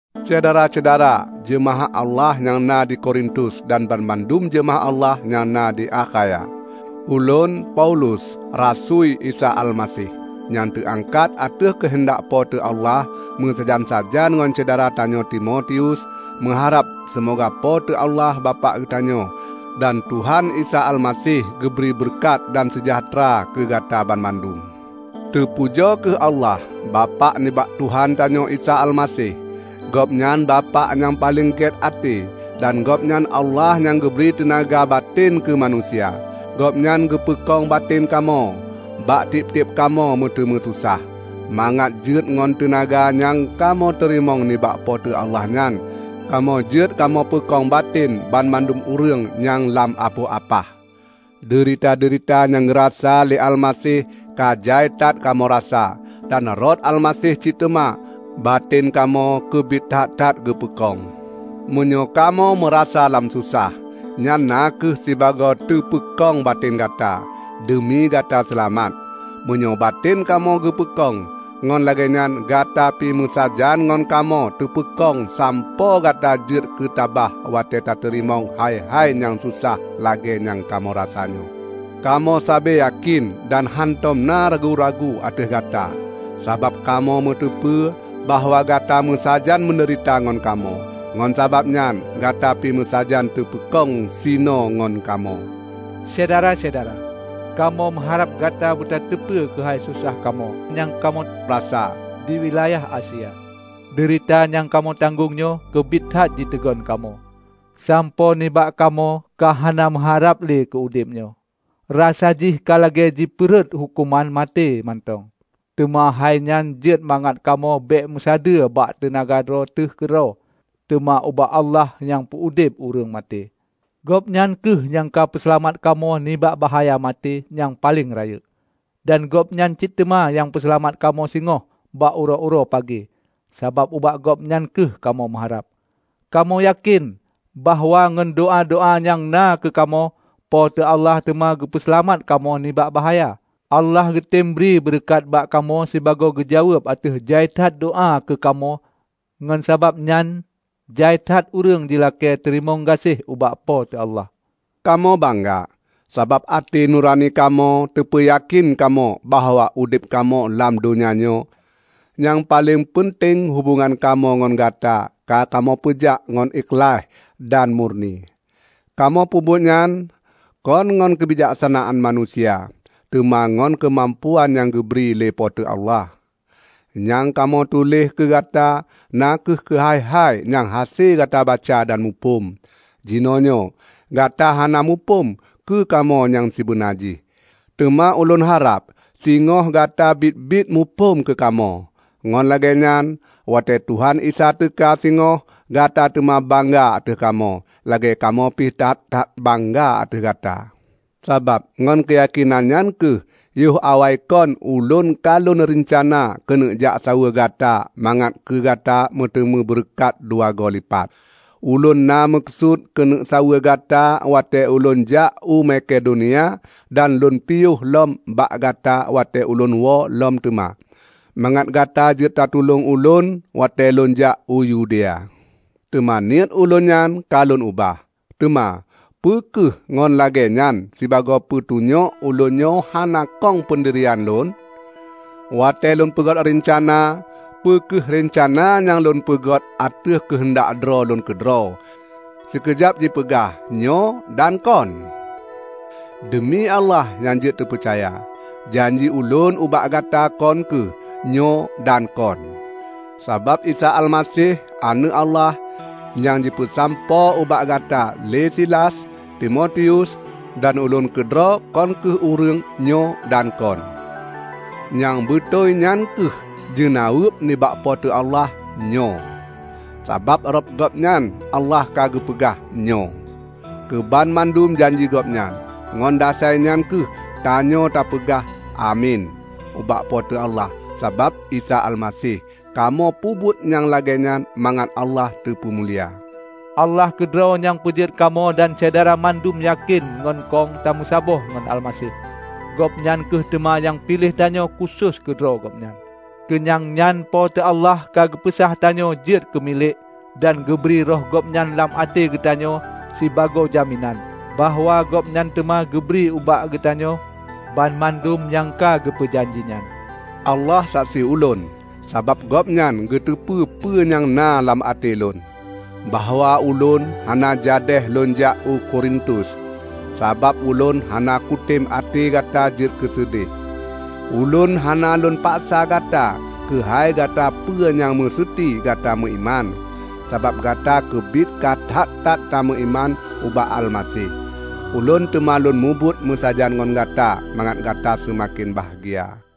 Syedara-syedara jeumaáh Allah nyang na di Korintus dan banmandum jeumaáh Allah nyang na di Akhaya. Ulôn, Paulus, rasui Isa Almaseh, nyang teuangkat ateueh keuheundak Po teu Allah, meusajan-sajan ngon syedara tanyoe Timotius, meuharab seumoga Po teu Allah Bapak geutanyoe dan Tuhan Isa Almaseh geubri beureukat dan seujahteura keu gata banmandum. Teupujoe kheueh Allah, Bapak nibak Tuhan tanyoe Isa Almaseh. Gobnyan Bapak nyang paleng gét até, dan Gobnyan Allah nyang geubri teunaga batén keu manusia. Gobnyan geupeukong baten kamoe bak tieb-tieb kamoe meuteumé susah, mangat jeuet ngon teunaga nyang kamoe teurimong nibak Po teu Allah nyan, kamoe jeuet kamoe peukong baten banmandum ureuëng nyang lam apoh apah. Deurita-deurita nyang geurasa lé Almaseh ka jai that kamoe rasa. Dan rot Almaseh cit teuma, baten kamoe keubiet that-that geupeukong. Meunyoe kamoe meurasa lam susah, nyan na kheueh sibagoe teupeukong baten gata, deumi gata seulamat. Meunyoe baten kamoe geupeukong, ngon lagée nyan gata pi meusajan ngon kamoe teupeukong sampoe gata jeuet keutabah watée tateurimong hai-hai nyang susah lagée nyang kamoe rasanyoe. Kamoe sabe yakén dan hántom na ragu-ragu ateueh Gata, sabab kamoe meuteupeu bahwa gata meusajan meudeurita ngon kamoe. Ngon sabab nyan gata pi meusajan teupeukong sinoe ngon kamoe. Syedara-syedara! Kamoe meuharab gata beutateupeue keuhai susah kamoe nyang kamoe rasa di wilayah Asia. Deurita nyang kamoe tanggong nyoe keubiet that jiteugon kamoe, sampoe nibak kamoe ka hana meuharab le keu udeb nyoe; rasa jih ka lagée jipeurhot huköman maté mantong. Teuma hainyan jeuet mangat kamoe bék meusadeue bak teunaga droe teuh keudroe, teuma ubak Allah nyang peu-udeb ureuëng maté. Gobnyan kheueh nyang ka geupeuseulamat kamoe nibak bahya maté nyang paleng rayeuk. Dan Gobnyan cit teuma nyang peuseulamat kamoe singoh bak uroe-uroe pagée, sabab, ubak Gobnyan kheueh kamoe meuharab. Kamoe yakén bahwa ngon doá-doá nyang na keu kamoe, Po teu Allah teuma geupeu seulamat kamoe nibak bahaya. Allah geutem geubri beureukat bak kamoe sibagoe geujaweueb ateueh jai that doá keu kamoe, ngon sabab nyan jai that ureuëng jilakée teurimong gaséh ubak Po teu Allah. Kamoe bangga, sabab até nurani kamoe teupeuyakén kamoe bahwa udeb kamoe lam donya nyoe -- nyang paleng peunteng hubongan kamoe ngon gata ka kamoe peujak ngon ikhlaih dan murni. Kamoe peubuet nyan, kon ngon keubijaksanaan manusia, teuma ngon keumampuan nyang geubri lé Po teu Allah. Nyang kamoe tuléh keu gata na kheueh keuhai-hai nyang hase gata baca dan muphom. Jinoenyoe gata hana muphom keu kamoe nyang sibeuna jih, teuma ulôn harab singoh gata biet-biet muphom keu kamoe. Ngon lagée nyan, watée Tuhan Isa teuka singoh, gata teuma bangga ateueh kamoe, lagée kamoe pih that-that bangga ateueh gata. Sabab ngon keuyakénan nyan kheueh yoh awaikon ulôn ka lôn reuncana keuneuk jak saweue gata mangat keu gata meuteumé beureukat dua goe lipat. Ulôn na meukeusut keuneuk saweue gata watée ulôn jak u Makedonia dan lôn piôh lom bak gata watée ulôn woe lom teuma, mangat gata jeuet tatulông ulôn watée lônjak u Yudea. Teuma niet ulôn nyan ka lôn ubah; teuma, peu kheueh ngon lagée nyan sibagoe peutunyok ulôn nyoe hana kong peundirian lôn? Watée lôn peugét reuncana, peu kheueh reuncana nyang lôn peugét ateueh keuheundak droe lôn keudroe, sikeujab jipeugah, "Nyoe" dan "Kon"? Deumi Allah nyang jeuet teupeucaya, janji ulôn ubak Gata kon kheueh "Nyoe" dan "Kon". Sabab Isa Almaseh, Aneuëk Allah, nyang jipeusampoe ubak gata lé Silas, Timotius, dan ulôn keudroe kon kheueh ureuëng "Nyoe" dan "Kon". Nyang beutôi nyan kheueh jeunaweueb nibak Po teu Allah "Nyoe". Sabab rot Gobnyan Allah ka geupeugah "Nyoe" keubanmandum janji Gobnyan. Ngon dasai nyan kheueh tanyoe tapeugah "Amin" ubak Po teu Allah sabab Isa Almaseh. Kamoe peubuet nyang lagée nyan mangat Allah teupeumulia. Allah keudroe nyang peujeuet kamoe dan Syedara mandum yakén ngon kong tameusaboh ngon Almaseh; Gobnyan kheueh teuma nyang piléh tanyoe khusos keu droe Gobnyan. Keu nyang nyan Po teu Allah ka geupeusah tanyoe jeuet keumilék dan geubri Roh Gobnyan lam até geutanyoe sibagoe jaminan bahwa Gobnyan teuma geubri ubak geutanyoe banmandum nyang ka geupeu janji nyan. Allah saksi ulôn -- sabab Gobnyan geuteupeue peue nyang na lam até lôn -- bahwa ulôn hana jadéh lônjak u Korintus, sabab ulôn hana kutem até gata jeuet keuseudeh. Ulôn hana lôn paksa gata keuhai gata peue nyang meuseuti gata meuiman, sabab gata keubiet ka that-that tameuiman ubak Almaseh. Ulôn teuma lôn mubuet meusajan ngon gata mangat gata seumaken bahgia.